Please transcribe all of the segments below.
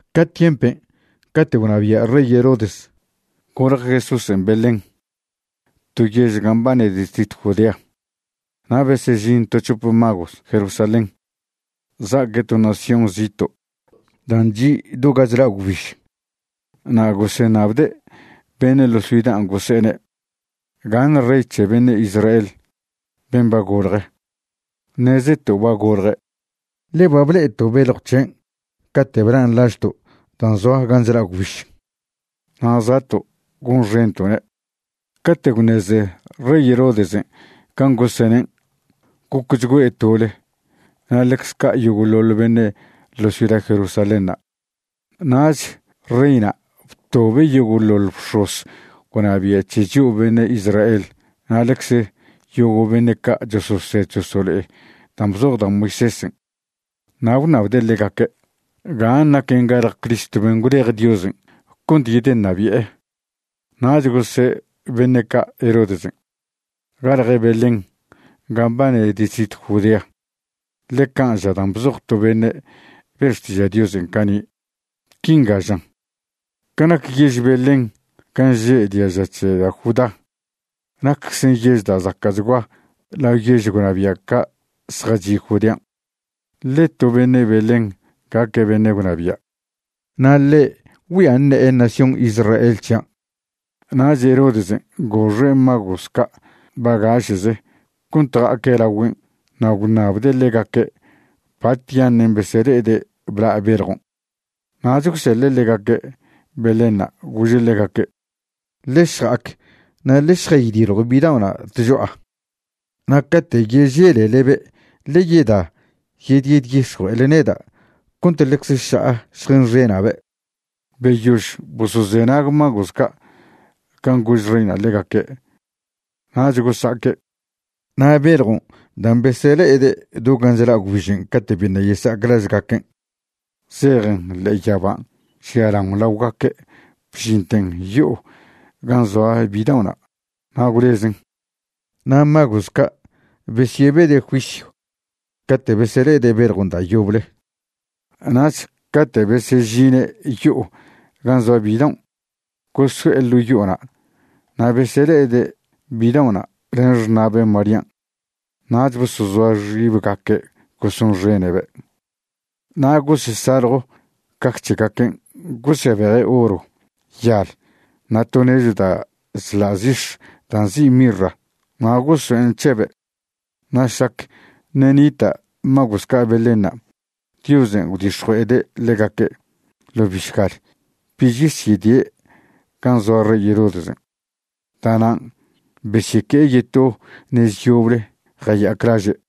Ca tiempen' cate' gwnabia' rey Herodes, golje Jesúsen' Belén, to yež gan' mbane distritw Judea. Na' besežin to c̱hope magos Jerusalén, za'aque' to nación zito' dan' chi' do ga chla' gwbiž. Na' goseṉabde' beṉe' ḻo ciudan' gose'ene': ―¿Gaṉ rey c̱he beṉe' Israel, ben' ba golje? Ṉezeto' ba golje', ḻe ba ble'eto' beljw c̱hen' cate' blan' lažto' dan' zoa gan' chla' gwbiž. Na' za'to' gonxento'ne'. Cate' gwṉeze rey Herodesen' can' gosenen', gocchgüe' tole, na' ḻecze ca' yogo'ḻoḻ beṉe' ḻo ciuda Jerusalénṉa'. Nach reyna' btobe' yogo'ḻoḻ bx̱oz gwnabia' c̱he chio' beṉe' Israel na' ḻecze yogo' beṉe' ca' chososed chosolo'e dan' bzoj da' Moisésen'. Na' gwṉabde' ḻegaque' gan' naquen galje Criston' ben' gwlej Diosen' cont yedeṉabi'e. Nach gose' beṉe' ca' Herodesen': ―Galje' Belén, gan' mbane distritw Judea, ḻe can' ža dan' bzoj to beṉe' be' xtiža' Diosen' cani'. Quinga žan: Ca nac yež Belén gan' že' diaža c̱he da' Judá, nacczen yež da' zaca'chgua lao yež gwnabia' ca' zjachi' Judean'. Ḻe to beṉe' Belén gaque' beṉe' gwnabia', na' ḻe' güia ṉe'e nación Israel c̱hian'. Nach Herodesen' goxe' magos ca' bagaše'ze cont ja'aque' lagüen' na' gwnabde' ḻegaque' batyaṉen' besele'ede' bla' beljon'. Nach gwseḻe' ḻegaque' Belénṉa', gože' ḻegaque': ―Ḻe šja'ac na' ḻe šjaydiljw bidao'na' tcho'a. Na' cate' yeželelebe' ḻe yeda yedyedix̱jue'ele neda' cont ḻecze ša'a šjenxena'be'. Beyož bosozenag magos ca' can' gož reyna' ḻegaque', nach gosa'aque'. Na' beljon' dan' besele'ede' do gan' chla' gwbižen' cate' biṉa' yesa'ac lažgaquen', zejen ḻe'e yaban' žialaon laogaque' bžinten yo'o gan' zoa bidao'na', na' gwlezen. Na' magos ca' besyebede' juisyw cate' besele'ede' beljon' da' yoble. Nach cate' besežine' yo'o gan' zoa bidaon', goso'e ḻo' yo'ona' na' besele'ede' bidao'na' len xṉa'be' Marían'. Nach bosozoa xibgaque' gosonxene'be'. Na' gosesaljo caj c̱hegaquen' gosebeje' oro, yal na' to nechw da' chḻa' zix̱ da' nzi' mirra na' gosoen' c̱hebe'. Na' šlac ṉe' nita' magos ca' Belénṉa', Diosen' gwdix̱jue'ede' ḻegaque' ḻo bišgal bich yesyedie' gan' zoa rey Herodesen'. Da'nan' besyeque'e yeto nez yoble jaya'ac laže'.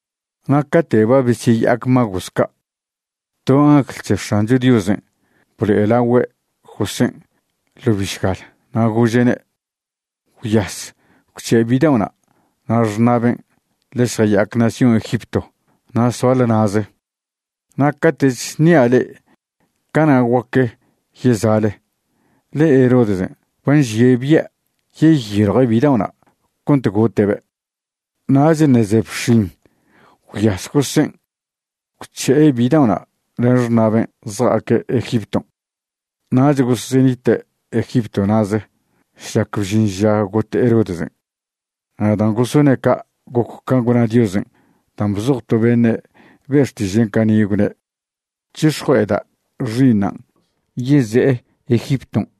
Na' cate' ba besyeya'ac magos ca', to angl c̱he X̱ancho Diosen' blo'elagüe' Josén' ḻo bišgal, na' gože'ne': ―Gwyas, gwc̱he' bidaon' na' xṉa'ben' ḻe šja'ac nación Egipto na' soale na'ze, na' cate'ch ṉia' le'e, cana' guaque yeza'le, ḻe Herodesen' ba nžie' bia' yeyiljue' bidao'na' cont gote'be'. Nach ṉe' ze bx̱in gwyas Josén', gwc̱he'e bida'ona' len xṉa'ben' zja'aque' Egipton'. Nach gosenite' Egipto na'ze šlac bžin ža got Herodesen'. Na' dan' gosone' ca' goc can' gwna Diosen' dan' bzoj to beṉe' be' xtiže'na' cani', gwne': “C̱hix̱jue'eda' Xi'iṉan' yeze'e Egipton'.”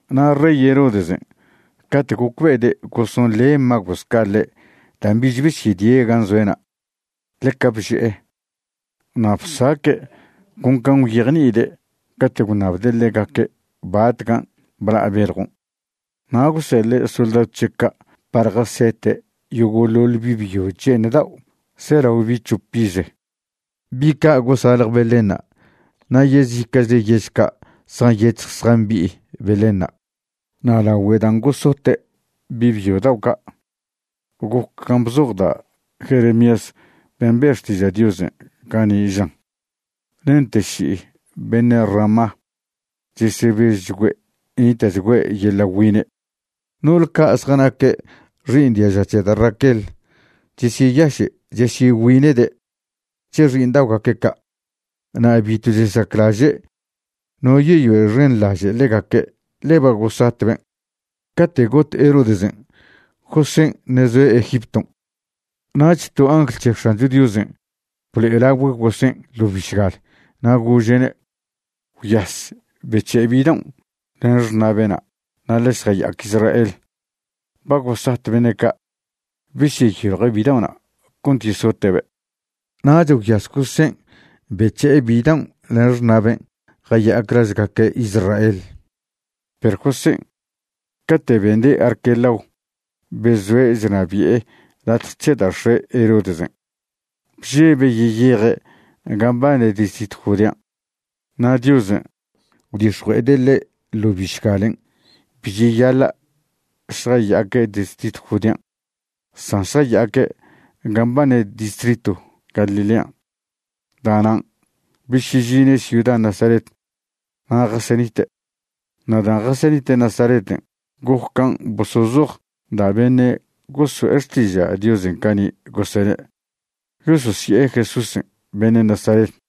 Na' rey Herodesen', cate' gocbe'ede' gosonḻe magos ca' ḻe' dan' bich besyedie' gan' zoe'na', ḻeca bže'e. Na' bsaque' con can' gwyejni'ide' cate' gwṉabde' ḻegaque' batcan' bla' beljon', na' gwseḻe' soldadw c̱he' ca' par jasete' yogo'ḻoḻ bi' byo che'eṉ dao' zelao bi' c̱hop ize, bi' ca' gosalje Belénṉa' na' yezica'chle yež ca' zjanyec̱hj zjambi'i Belénṉa'. Na' lagüe dan' gosote' bi' byo dao' ca', goc can' bzoj da' Jeremías ben' be' xtiža' Diosen' cani', žan: Nente ši'i beṉe' Ramá, chesebežchgüe' nita'chgüe' yeḻa' güine'. No'ole ca' zjanaque' xi'iṉ diaža c̱he da' Raquel chesyeyaše' chesyegüine'de' c̱he xi'iṉda'ogaque' ca', na' bitw chesaclaže' no yeyoexenḻaže' ḻegaque', ḻe ba gosatben'. Cate' got Herodesen', Josén' ṉe' zoe' Egipton'. Nach to angl c̱he X̱ancho Diosen' blo'elagüe' Josén' ḻo bišgal, na' gože'ne': ―Gwyas, bec̱he' bidaon' len xṉa'be'na' na' ḻe šjaya'ac Israel. Ba gosat beṉe' ca' besyeyiljw bidao'na' cont yesote'be'. Nach gwyas Josén' bec̱he'e bidaon' len xṉa'ben' jaya'ac lažgaque' Israel. Perw Josén', cate' bende' Arquelao bezoe' chnabi'e latje c̱he da' x̱e' Herodesen', bžebe' yeyeje' gan' mbane distritw Judean'. Na' Diosen' gwdix̱jue'ede' ḻe' ḻo bišgalen' bi cheyaḻa' šjaya'aque' distritw Judean', san šjaya'aque' gan' mbane distritw Galilean'. Da'nan' besyežine' ciuda Nazaret na' jasenite'. Na' dan' jasenite' Nazareten' goc can' bosozoj da' beṉe' goso'e xtiža' Diosen' cani', gosene': “Yososi'e Jesúsen' beṉe' Nazaret.”